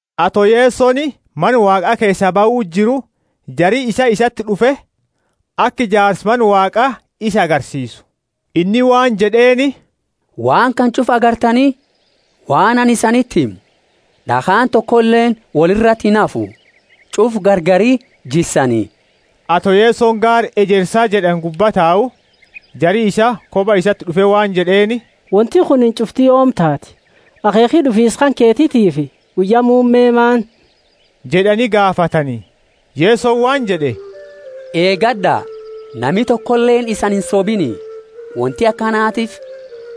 Ato Yesoni Mana Waaqa keesaa bahu jiru, jari isaa isati d'ufe, aka ijaarsa Mana Waaqa isa agarsiisu. Inni waan jed'eeni, Waan kana ch'ufa agartani? Waan anini isaniti himu, d'akhaani tokoleeni woli irati inhafu, ch'ufa gargari jissani. Ato Yesoni gaara Ejersa jed'ani gubba tau, jari isaa koba isati d'ufe waan jed'eeni, Wonti kunini ch'ufti yoomi taati? Akheekhi d'ufiisa kanketitiifi guyya muumme maani? jed'ani gaafatani. Yesoni waan jed'e, Eegad'a, nami tokoleeni isani insobini. Wonti akanatiifi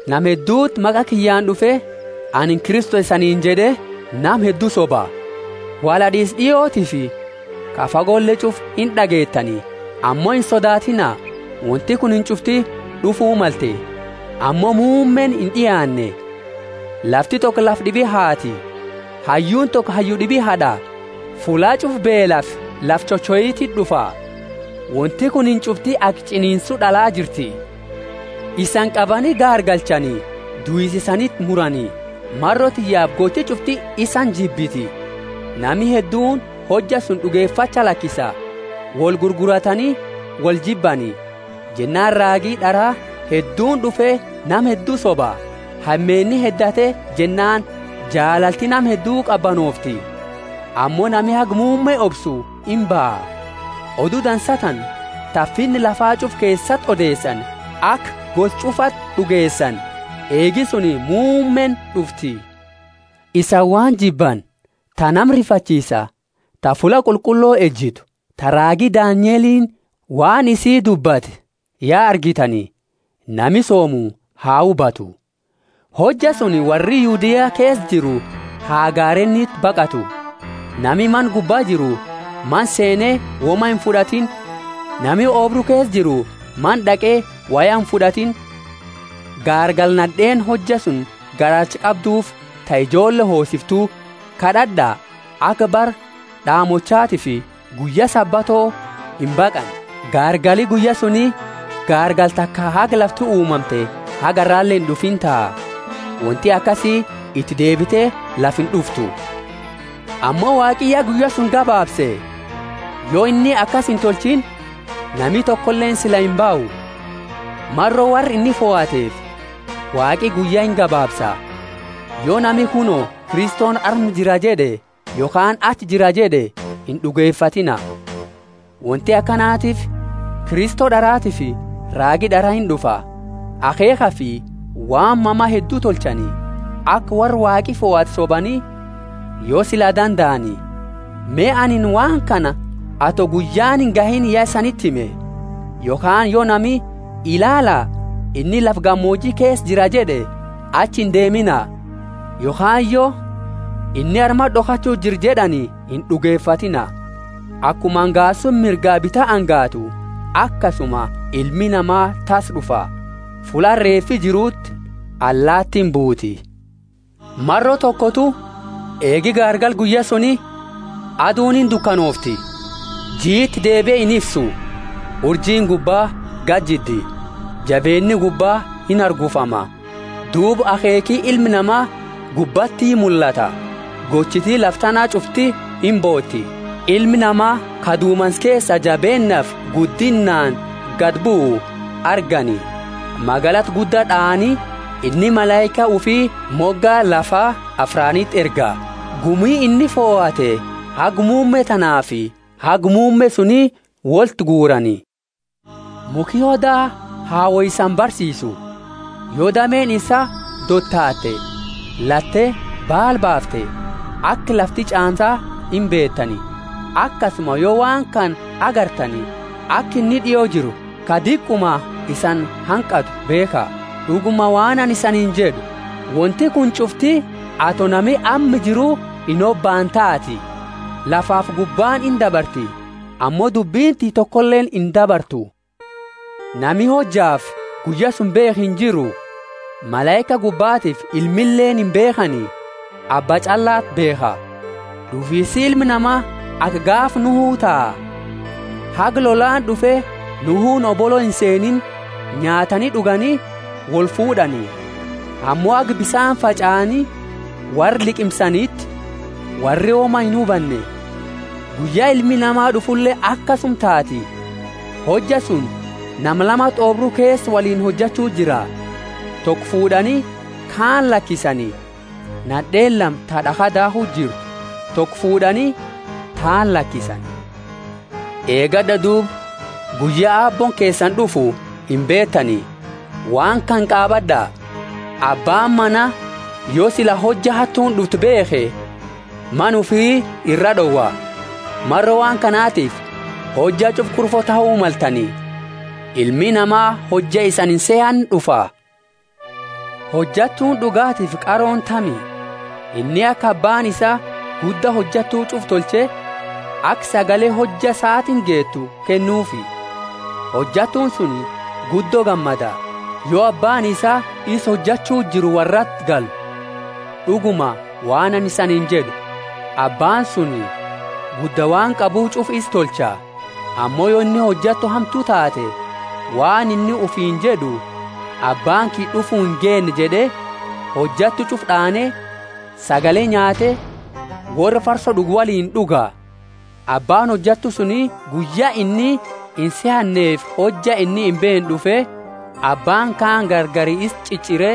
nama hedduti maqa kiyyaani d'ufe, Anini Kristo isaniini jed'e, nama heddu soba. Wolhad'iisa d'iotiifi ka fagole ch'ufa ind'ageetani, ammo insodaatiina, wonti kunini ch'ufti d'ufu malte, ammo muummeeni ind'iaanne. Lafti toko lafa d'ibi haati, hayyuuni toko hayyu d'ibi had'a. Fulla ch'ufa beelafi lafa chochoititi d'ufa; wonti kunini ch'ufti aka ch'iniinsu d'ala jirti. Isani qabani gaargalchani duisa isaniti murani. Maro tiyyaafi gochi ch'ufti isani jibbiti. Nami hedduuni hojja suni d'ugefacha lakisa, woli gurguratani, woljibbani. Jennaani raagi d'ara hedduuni d'ufe nama heddu soba. Hameenni heddate jennaani jaalalti nama heddu qabanoofti. Ammo nami haga muumme obsu imbaha. Odu Dansa tana ta Finna lafa ch'ufa keesati odeesani, aka gosa ch'ufati d'ugeesani, eegi suni muummeeni d'ufti. Isani waan jibbani, ta nama rifachiisa, ta fulla qulqullo ejitu, ta raagi Danielini waan isii dubbate ya argitani (nami soomu ha hubatu) hojja suni worri Yudea keesa jiru ha gareeniti baqatu. Nami mana gubba jiru mana seene woma imfud'atiini. Nami oobru keesa jiru mana d'aqe woya imfud'atiini. Gaargala nad'eeni hojja suni garaacha qabduufi ta ijoolle hoosiftu! Kad'ad'a, aka bara d'aamochatiifi guyya Sabato imbaqanne! Gaargali guyya suni gaargala taka haga lafti uumamte haga arrale ind'ufiini taha. Wonti akasi iti deebite lafa ind'uftu. Ammo Waaqi ya guyya suni gabaabse; yo inni akasi intolchiini, nami tokoleeni sila imbahu. Maro worra inni fohateefi, Waaqi guyya ingabaabsa. Yo nami, Kuno, Kristoni arma jira jed'e, yokhaani, Achi jira jed'e, ind'ugefatiina. Wonti akanatiifi Kristo d'aratiifi raagi d'ara ind'ufa, akheekhafi waan mama heddu tolchani, aka worra Waaqi fohate sobani, yo sila dandaani. Me, anini waan kana ato guyyaani ingahiini ya isaniti hime. Yokhaani, yo nami, Ilaala, inni lafa gamooji keesa jira jed'e, achi indeemina; yokhaani yo, Inni armati d'okhachu jira jed'ani, ind'ugefatiina. Akuma angaasuuni mirgaa bita angaatu, akasuma Ilmi Nama tassa d'ufa. Fulla reefi jiruti allaatiini buuti. Maro tokotu, eegi garagala guyya suni, aduuni indukanoofti, jii iti deebie inifsu, urjiini gubba gadi jiddi, jabeenni gubba inhargufama. Duuba akheekhi Ilma Nama gubbati mullata; gochiti lafa tana ch'ufti imbooti, Ilma Nama ka dumansa keesa jabeennaafi guddinnaani gadi buu argani. Magalata gudda d'aani, inni malaika ufi moga lafa afraaniti erga, gumi inni fohate haga muumme tanaafi haga muumme suni woltiguurani. Mukhi oda ha woi isani barsiisu. Yo dameeni isaa dotaate latte baala baafte, aka lafti ch'aamsa imbeetani. Akasuma yo waan kana agartani aka inni d'io jiru, ka diquma isani hanqatu beekha. D'uguma, waan anini isaniini jed'u, Wonti kuni ch'ufti, ato nami amma jiru inhobaane taati. Lafafi gubbaani indabarti, ammo dubbini tiyya tokoleeni indabartu. Nami hojafi guyya suni beekhu injiru, malaika gubbatiifi Ilmileeni imbeekhani, Abba ch'allati beekha. D'ufiisi Ilma Nama aka gaafa Nuhu taha. Haga lollaani d'ufe Nuhuuni hobolo inseeniini nyaatani d'ugani wolfuud'ani. Ammo haga bisaani fach'aani worra liqimsaniti worri woma inhubanne. Guyya Ilmi Nama d'ufule akasuma taati. Hojja suni nama lamati oobru keesa woliini hojachu jira: toko fuud'ani, kaani lakisani. Nad'eeni lama ta d'akha daakhu jirti: toko fuud'ani, taani lakisani. Eegad'a duuba, guyya Aabbooni keesani d'ufu imbeetani. Waan kana qaabad'a: Abbaani mana, yo sila hojja hattuuni d'uftu beekhe, mana ufi iraa d'owa. Maro waan kanatifi, hojja ch'ufa kurfo tahu maltani. Ilmi Nama hojja isani insehanne d'ufa. Hojattuuni d'ugatiifi qarooni tami? Inni ka abbaani isaa gudda hojattu ch'ufaa tolche, aka sagale hojja saatiini geetu kennuufi. Hojattuuni suni guddo gammada, yo abbaani isaa isa hojachu jiru worrati galu. D'uguma, waan anini isaniini jed'u, abbaani suni gudda waan qabu ch'ufa isa tolcha. Ammo yo inni hojattu hamtu taate, waan inni ufiini jed'u, Abbaani kiyya d'ufu ingeenne jed'e, hojattu ch'ufa d'aane, sagale nyaate, worra farso d'ugu woliini d'uga. Abbaani hojattu suni guyya inni insehannefi hojja inni imbeenne d'ufe, Abbaani kaani gargari isa ch'ich'ire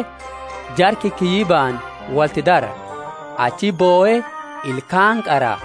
jara kikiyyibani wolti dara. Achiti bohe ilkaani qara.